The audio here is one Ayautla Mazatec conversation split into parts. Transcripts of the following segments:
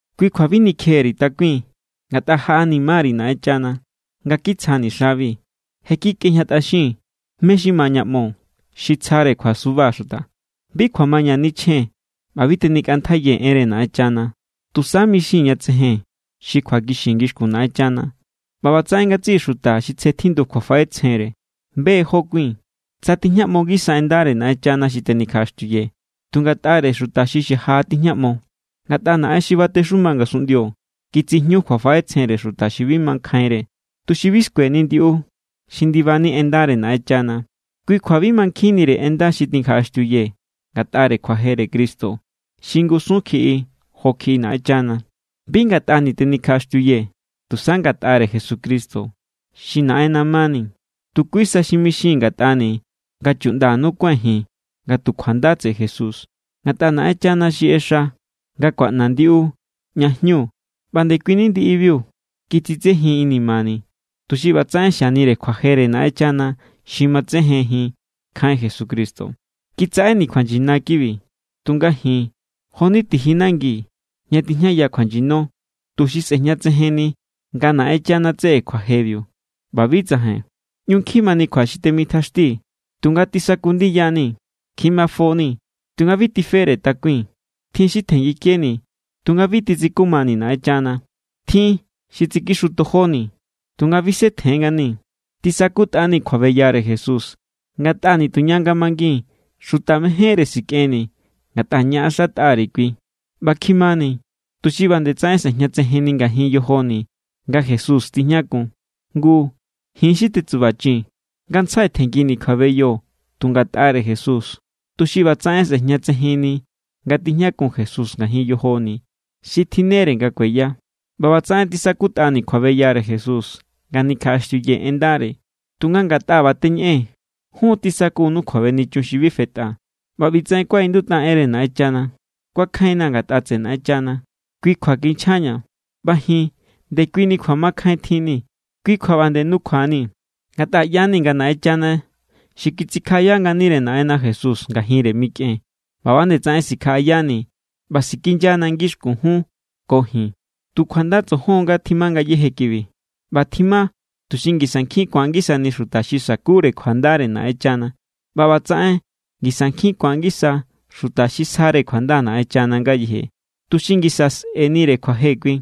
Kui kjua bi nikjeni_ri̱ takui̱n. Ngatꞌa jaꞌanima_ri̱ Naꞌenchana nga kitsjani̱ xabi. Je kikꞌejñatꞌaxii̱n mé= xi ma ña ꞌmo, xi tsjare kjuasuba xuta. Bi kjuamaña nichjee̱n ꞌba bi tenikꞌantjaiyee̱ enre Naꞌenchana. Tusa mixii̱n ña tsejen xi kjuakixi ngixkun Naꞌenchana ꞌba ꞌbatsaꞌen ngatsiꞌi xuta xi tsje tjindu kjuafaꞌetsjenre be= jó kui̱n. Tsa tijñaꞌmo ngisa en ndare Naꞌenchana xi tenikjaꞌaxtiuyee̱, tu ngatꞌare xuta xi xaja= tijñaꞌmo. Ngatꞌa naꞌen xi batexuma ngasunꞌndio kitsijñu kjuafaꞌetsjenre xuta xi bi makjainre, tuxi bi skueni ndiꞌu xi ndibani en ndare Naꞌenchana. Kui kjua bi mankjinnire en nda xi nikjaꞌaxtiuyee̱ ngatꞌare kjuajere Cristo xi ngusun kjiꞌi jo kjiꞌi Naꞌenchana. Bi ngatꞌani̱ tenikjaꞌaxtiuyee̱, tusa ngatꞌare Jesucristo xi Naꞌenna mani. Tu kui sa xi mixii̱n ngatꞌani̱ nga chuꞌndanu kuái̱n ji̱n nga tu kjuanda tseꞌe Jesús. Ngatꞌa Naꞌenchana xi ꞌexa nga ku̱aꞌna ndiꞌu ña jñu ꞌba ndekuini ndiꞌibiu kitsitsejin inimani̱, tuxi ꞌbatsaꞌen xianire kjuajere Naꞌenchana xi matsejenjin nkjain Jesucristo. Kitsaꞌeni̱ kjuanyina kibi. Tunga ji̱n jo=ni tiji nangi ña tijñaya kjuanyino, tuxi sꞌe̱jñatsejenni nga Naꞌenchana tseꞌe kjuañu jebiu ꞌba bi tsajain. ꞌÑu nkjin mani kjua xi temitjaxtii̱, tunga tisaku ndiya=ni̱. Kjimafoni̱, tunga bi tifere takui̱n. Tjin xi tjenngikeni̱, tunga bi titsikumani̱ Naꞌenchana. Tjin xi tsikixutojoni̱, tunga bisetjen nganii̱. Tisakutꞌani̱ kjuabeyare Jesús ngatꞌa nituña nga mangii̱n, xuta mejénre sikꞌenni̱ ngatꞌa ñaꞌaxatꞌa_ri̱ Kui. ꞌBa kjimani̱ tuxi ꞌba nde tsaꞌen sꞌejñatsejenni ngajin yojoni̱ nga Jesús tijñakun. Ngu, ji̱n xi tetsubachii̱n, ngantsjai tjenngini̱ kjuabeyo tu ngatꞌare Jesús, tuxi ꞌbatsaꞌen sꞌe̱jñatsejenni nga tijñakun Jesús ngajin yojoni̱ xi tjinnere nga kueya. ꞌBa ꞌbatsaꞌen tisakutꞌani̱ kjuabeyare Jesús nga nikjaꞌaxtiuyee̱ en ndare. Tunga ngatꞌa ꞌba teñeꞌee̱n, jun tisakunu kjuabenichun xi bi fetꞌa. ꞌBa ꞌbitsaꞌen kuaꞌindutꞌa enre Naꞌenchana: “Kuakjainna̱ ngatꞌa tseꞌe Naꞌenchana, kui kjua kinchjaña̱.” ꞌBa ji̱n ndekuini kjuamakjain tjinni̱, kui kjua ꞌba nde nukjuanii̱. Ngatꞌa ꞌya=ni nga Naꞌenchana xi kitsikjaꞌaya nganire Naꞌenna Jesús ngajinre mikꞌen, ꞌba nde tsaꞌen sikjaꞌayani̱ ꞌba sikinyana ngixkun jun ko ji̱n. Tu kjuanda tsojon nga tjima ngayéje kibi. ꞌBa tjima tuxi ngisa nkjin ku̱an ngisani xuta xi sa̱kure kjuandare Naꞌenchana. ꞌBa ꞌbatsaꞌen ngisa nkjin ku̱an ngisa xuta xi sjare kjuanda Naꞌenchana ngayeje, tuxi ngisa sꞌe̱nire kjuaje Kui.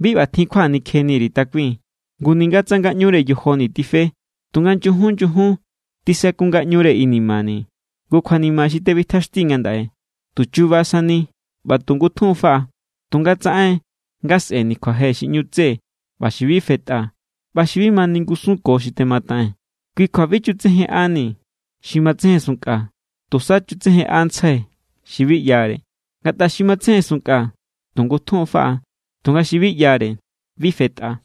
Bi ꞌbatjin kjua nikjeni_ri̱ takui̱n. Ngu ninga tsa ngaꞌñure yojoni̱ tife, tunga nyujun nyujun tisaku ngaꞌñure inimani̱. Ngu, kjuanima xi tebitjaxtii̱ ngandaꞌe, tu chuba sani ꞌba tu ngutjun= faꞌa. Tunga tsaꞌen nga sꞌe̱ni̱ kjuaje xi ꞌñu tse ꞌba xi bi fetꞌa ꞌba xi bi ma ningusunko xi temataꞌee̱n. Kui kjua bi chutsejenꞌani̱ xi matsejensunnkꞌa, tusa chutsejenꞌantsjai̱ xi bi ꞌyare. Ngatꞌa xi matsejensunnkꞌa, tu ngutjun= faꞌa, tunga xi bi ꞌyare bi fetꞌa.